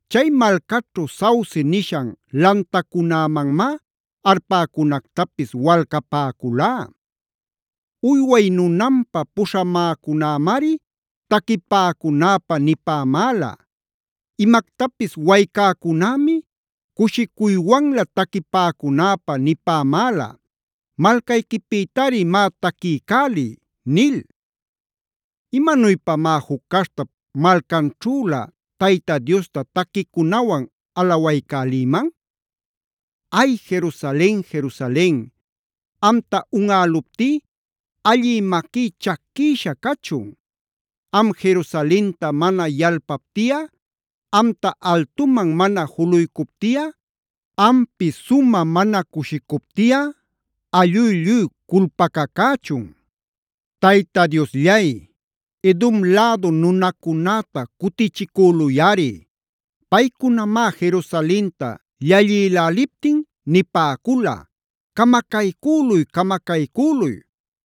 Chay malcaćhu sauce nishan lantacunämanmá arpäcunactapis walcapäculá. Uyway nunanpä puśhamäcunämari taquipäcunäpä nipämäla. Imactapis waycäcunämi cushicuywanlä taquipäcunäpä nipämäla: “Malcayquipïtari má taquiycäliy” nil. ¿Imanuypamá juc caśhtap malcanćhülä Tayta Diosta taquicunawan alawaycälïman? Ay, Jerusalen, Jerusalen, amta unꞌäluptí allï maquí chaquïsha cachun. Am Jerusalenta mana yalpaptiꞌa, amta altuman mana juluycuptiꞌa, ampi sumä mana cushicuptiꞌa allú lluy culpacacächun. Tayta Diosllay, Edom lädu nunacunäta cutichicüluyꞌari. Paycunamá Jerusalenta llallïläliptin nipäcula: “Camacaycüluy-camacaycüluy.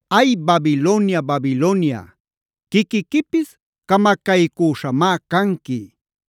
Ay, Babilonia, Babilonia quiquiquipis camacaycüśhamá canqui.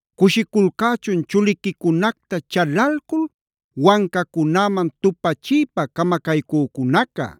Cushiculcächun chuliquicunacta chalalcul wancacunäman tupachiypa camacaycücunaca.